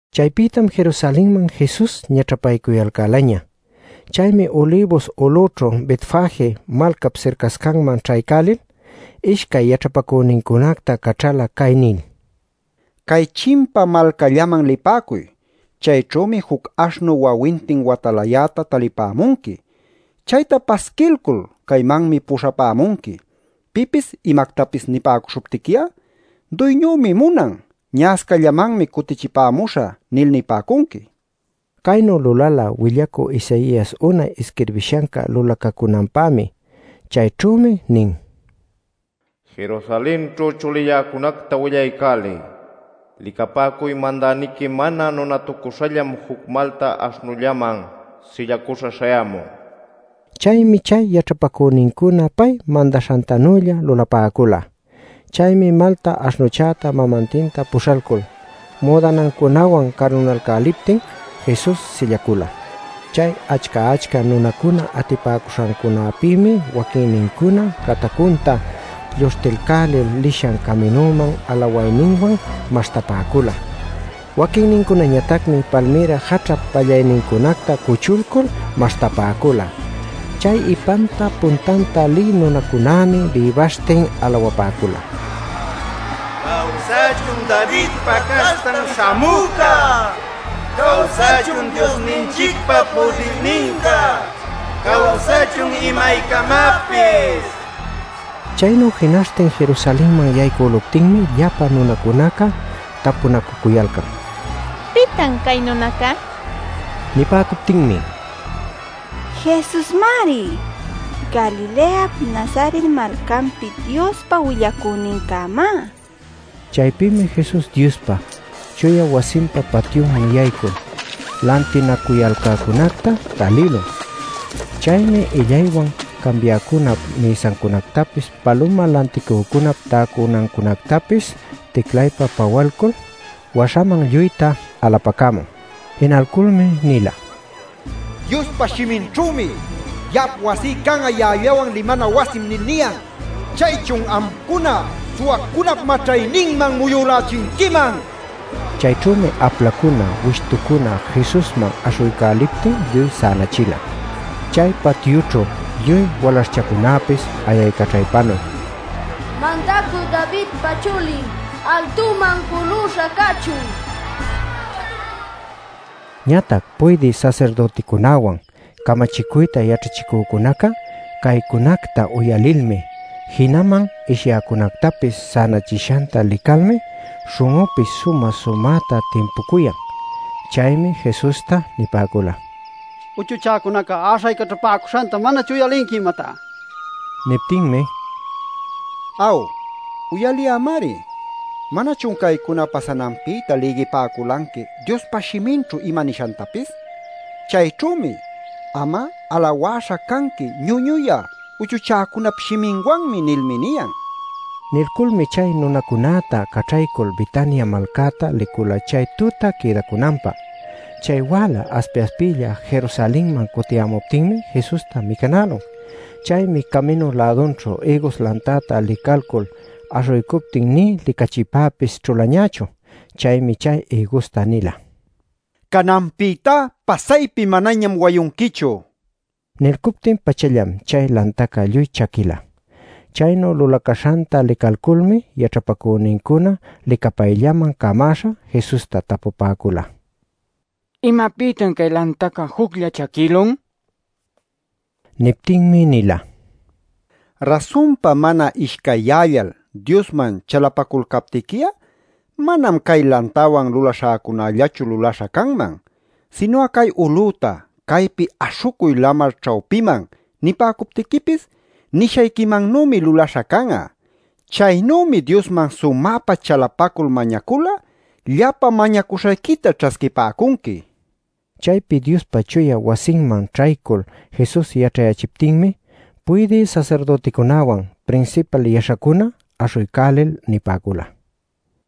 Chaypïtam Jerusalenman Jesus ñaćhapaycuyalcälaña. Chaymi Ulibus ulüćhu Betfage malcap sircascanman ćhaycälil, ishcay yaćhapacünincunacta caćhala cay nil: “Cay chimpa malcallaman lipäcuy. Chayćhümi juc aśhnu wawintin watalayäta talipämunqui. Chayta pasquilcul caymanmi puśhapämunqui. Pipis imactapis nipäcuśhuptiqui'a: ‘Duyñümi munan. Ña'ascallamanmi cutichipämuśhä’ nil nipäcunqui” nin. Caynu lulala willacü Isaias unay isquirbishanca lulacacünanpämi. Chayćhümi nin: “Jerusalenćhu chulilläcunacta willaycäliy: ‘Licapäcuy, Mandäniqui mana nunatucüśhallam juc malta aśhnullaman sillacuśha śhayämun’” nil. Chaymi chay yaćhapacünincuna pay mandaśhantanülla lulapäcula. Chaymi malta aśhnuchäta mamantinta puśhalcul müdanancunawan carunalcäliptin Jesus sillacula. Chay achca-achca nunacuna atipäcuśhancunapïmi waquinnincuná catacunta lluśhtilcälil lishan caminuman alawayninwan maśhtapäcula. Waquinnincunañatacmi palmïra jaćhap pallaynincunacta cuchulcul maśhtapäcula. Chay ipanta puntanta lï nunacunämi bïbaśhtin alawapäcula: “¡Cawsachun Davidpa caśhtan śhamüca! ¡Cawsachun Diosninchicpa pudirninca! ¡Cawsachun imaycamapis!” nil. Chaynu jinaśhtin Jerusalenman yaycüluptinmi llapa nunacunaca tapunacücuyalcan: “¿Pitan cay nunaca?” nil. Nipäcuptinmi: “¡Jesusmari! ¡Galileap Nazaret malcanpi Diospa willacünincämá!” nin. Chaypïmi Jesus Diospa chuya wasinpa patyunman yaycul lantinacuyalcäcunacta talïlun. Chaymi illaywan cambiäcunap mïsancunactapis paluma lanticücunap täcunancunactapis ticlaypa-pawalcul waśhaman lluyta alapacämun. Jinalculmi nila: “Diospa shiminćhümi ‘Ya'ap wasí can'a ya'allawan limana wasim’ nil niyan. ¡Chaychun amcuna suwacunap maćhayninman muyülälichinquiman!” nil. Chayćhümi aplacuna wishtucuna Jesusman aśhuycäliptin lluy sänachila. Chay patyućhu lluy walaśhchacunapis ayaycaćhaypanuy “Mandacü Davidpa chulin altuman juluśha cachun” nipäcula. Ñatac puydï sasirdüticunäwan, camachicuyta yaćhachicücunaca caycunacta uyalilmi, jinaman ishyäcunätapis sänachishanta licalmi śhun'unpis sumä-sumäta timpucuyan. Chaymi Jesusta nipäcula: “Uchuchäcunaca äśhaycaćhapäcuśhanta ¿manachun uyalinqui imatá?” nil. Niptinmi: “Aw, uyaliyämari. ¿Manachun caycuna pasananpïta lïgipäculanqui Diospa shiminćhu ima nishantapis? Chayćhümi: ‘Am'a alawäśha canqui ñuñuyä uchuchäcunap shiminwanmi’ nilmi niyan” nila. Nilculmi chay nunacunäta caćhaycul Betania malcäta licula chay tuta quïdacunanpä. Chay wäla aspi-aspilla Jerusalenman cutiyämuptinmi Jesusta micanälun. Chaymi caminu-lädunćhu ïgus lantacta licälul aśhuycuptin nï licachipäpis ćhulañächu. Chaymi chay ïgusta nila: “Cananpïtá pasaypi manañam wayunquichu” nil. Nilcuptin-pachallam chay lantaca lluy chaquïla. Chaynu lulacäśhanta licalculmi yaćhapacünincuna licapayllaman camäśha Jesusta tapupäcula: “¿Imapïtan cay lantaca juclla chaquïlun?” nil. Niptinmi nila: “Rasunpa mana ishcayyällal Diosman chalapaculcaptiqui'a, manam cay lantawan lulaśhäcunällachu lulaśha canman. Sinu'a cay ulüta ‘Caypi aśhucuy lamar ćhawpiman’ nipäcuptiquipis, nishayquimannümi lulaśha can'a. Chaynümi Diosman sumäpa chalapacul mañacul'a, llapa mañacuśhayquita ćhasquipäcunqui” nil. Chaypi Diospa chuya wasinman ćhaycul Jesus yaćhayächiptinmi, puydï sasirdüticunäwan, prinsipal yaśhacuna aśhuycälil nipäcula: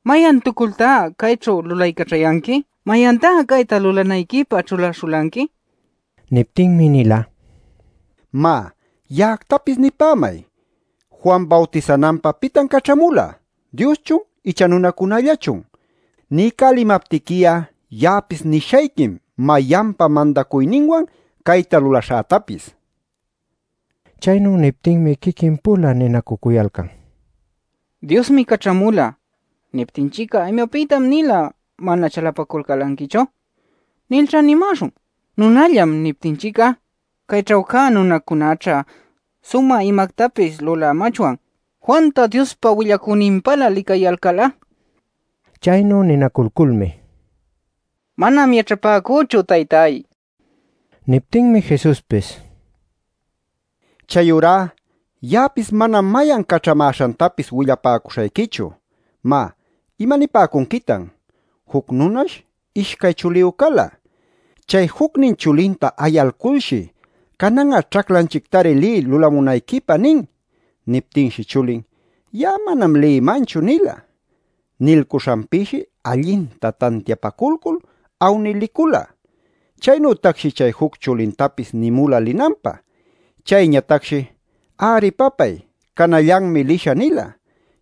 “¡¿Mayantucultá cayćhu lulaycaćhayanqui?! ¡¿Mayantá cayta lulanayquipä ćhulaśhulanqui?!” nil. Niptinmi nila: “Má, ya'actapis nipämay: Juan bawtisananpä ¿pitan caćhamula? ¿Dioschun icha nunacunällachun? Niycälimaptiqui'a ya'apis nishayquim mayanpa mandacuyninwan cayta lulaśhätapis” nil. Chaynu niptinmi quiquin-pula ninacücuyalcan: “ ‘Diosmi caćhamula’ niptinchic'a ‘¿Imapïtan-nila mana chalapaculcälanquichu?’ nilćha nimäśhun. ‘Nunallam’ niptinchic'a, cayćhu cä nunacunäćha sumä imactapis lulämachwan Juanta Diospa willacüninpälä licayalcal'a” nin. Chaynu ninaculculmi: “Manam yaćhapäcüchu, taytay” nin. Niptinmi Jesuspis: “Chayurá ya'apis manam mayan caćhamäśhantapis willapäcuśhayquichu. “Má ¿imanipäcunquitan? Juc nunash ishcay chuliyu cala. Chay jucnin chulinta ayalculshi ‘Canan'a ćhaclanchictari liy lulamunayquipä’ nin. Niptinshi chulin: ‘Ya'a manam lïmanchu’ nila. Nilcuśhanpïshi allinta tantiapaculcul awnil licula. Chaynütacshi chay juc chulintapis nimula linanpä. Chayñatacshi: ‘Ari papay, canallanmi lishä’ nila.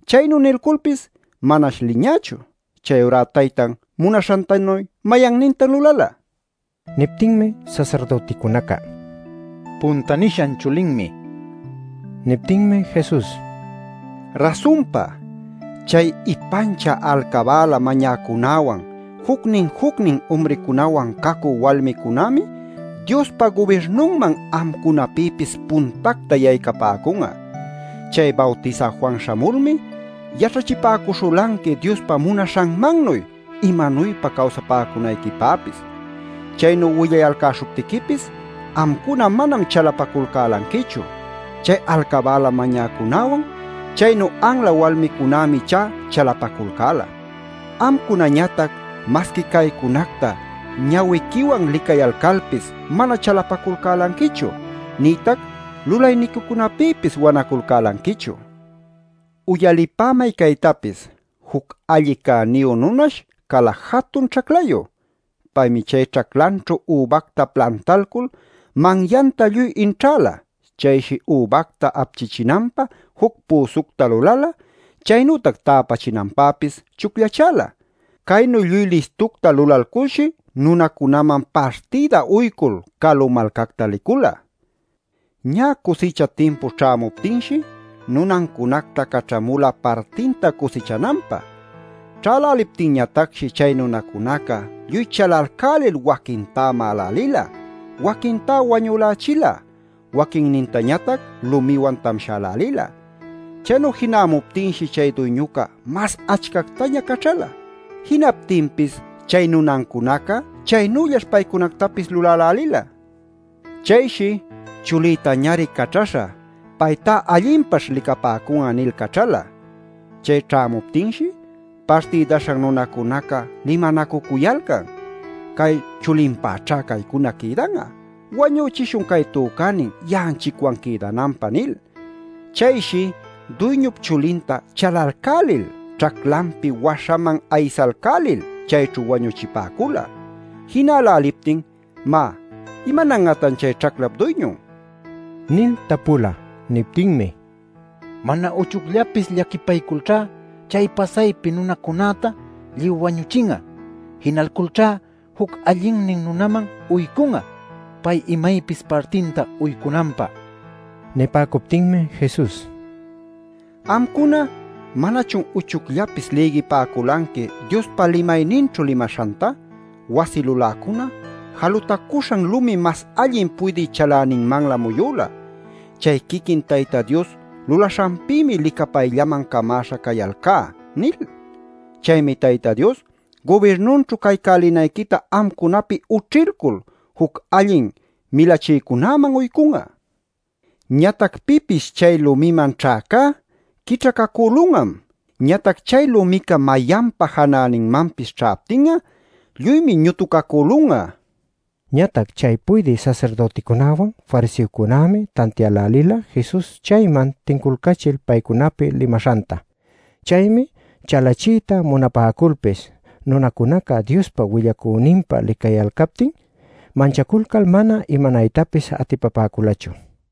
Chaynu nilculpis manash liñächu. Chayurá taytan munaśhantanuy ¿mayannintan lulala?” nin. Niptinmi sasirdüticunaca: “Punta nishan chulinmi” nipäcula. Niptinmi Jesus: “Rasunpa, chay ipanchä alcabäla mañäcunäwan jucnin jucnin umricunawan cacü walmicunämi Diospa gubirnunman amcunapïpis puntacta yaycapäcun'a. Chay Bawtisä Juan śhamulmi yaćhachipäcuśhulanqui Diospa munaśhanmannuy imanuypa cawsapäcunayquipäpis. Chaynu willayalcäśhuptiquipis amcuna manam chalapaculcälanquichu. Chay alcabäla mañäcunäwan, chaynu anla walmicunämi ichá chalapaculcäla. Amcunañatac masqui caycunacta ñawiquiwan licayalcalpis mana chalapaculcälanquichu, nïtac lulayniquicunapïpis wanaculcälanquichu. “Uyalipämay caytapis: Juc alli cäniyu nunash cala jatun ćhaclayu. Paymi chay ćhaclanćhu übacta plantalcul manyanta lluy inćhäla. Chayshi übacta apchichinanpä juc püsucta lulala, chaynütac täpachinanpäpis chucllachäla. Caynu lluy listucta lulalculshi nunacunaman partïda uycul calu malcacta licula. Ñä cusicha timpu ćhämuptinshi, nunancunacta caćhamula partinta cusichananpä. Ćhäläliptinñatacshi chay nunacunaca lluy chalalcälil, waquintá ma'alälila, waquintá wañülächila, waquinnintañatac lumiwan tamshälälila. Chaynu jinämuptinshi chay duyñuca mas achcactaña caćhala. Jinaptinpis chay nunancunaca chaynüllash paycunactapis lulälälila. Chayshi ‘Chulïtañari caćhaśhä; paytá allinpaćh licapäcun'a’ nil caćhala. Chay ćhämuptinshi, partïdaśhan nunacunaca limanacucuyalcan: ‘Cay chulinpäćhá caycuna quïdan'a. Wañüchishun cay tücänin ya'anchicwan quïdananpä’ nil. Chayshi duyñup chulinta chalalcälil, ćhaclanpi waśhaman aysalcälil chayćhu wañuchipäcula. Jinäläliptin ¿má, imanan'atan chay ćhaclap duyñun?” nil tapula. Niptinmi: “Mana uchucllapis llaquipayculćha chay pasaypi nunacunäta lluy wañüchin'a. Jinalculćha juc allinnin nunaman uycun'a, pay imaypis partinta uycunanpä” nipäcula. Nipäcuptinmi Jesus: “Amcuna ¿manachun uchucllapis lïgipäculanqui Diospa limayninćhu limaśhanta: ‘Wasi luläcuna jalutacuśhan lumim mas allin puydï chaläninmanlä muyüla. Chay quiquin Tayta Dios lulaśhanpïmi licapayllaman camaśha cayalcá’ nil? “Chaymi Tayta Dios gubirnunćhu caycälinayquita amcunapi ućhilcul juc allin milachïcunäman uycun'a. Ñatac pipis chay lumiman ćhäcá, quićhacacülun'am. Ñatac chay lumica mayanpa janäninmanpis ćhaptin'a lluymi ñutucacülun'a” nin. Ñatac chay puydï sasirdüticunawan fariseocunämi tantiälälila Jesus chayman tinculcachil paycunapi limaśhanta. Chaymi chalachiyta munapäculpis nunacunaca Diospa willacüninpä licayalcaptin manchaculcal mana imanaytapis atipapäculachu.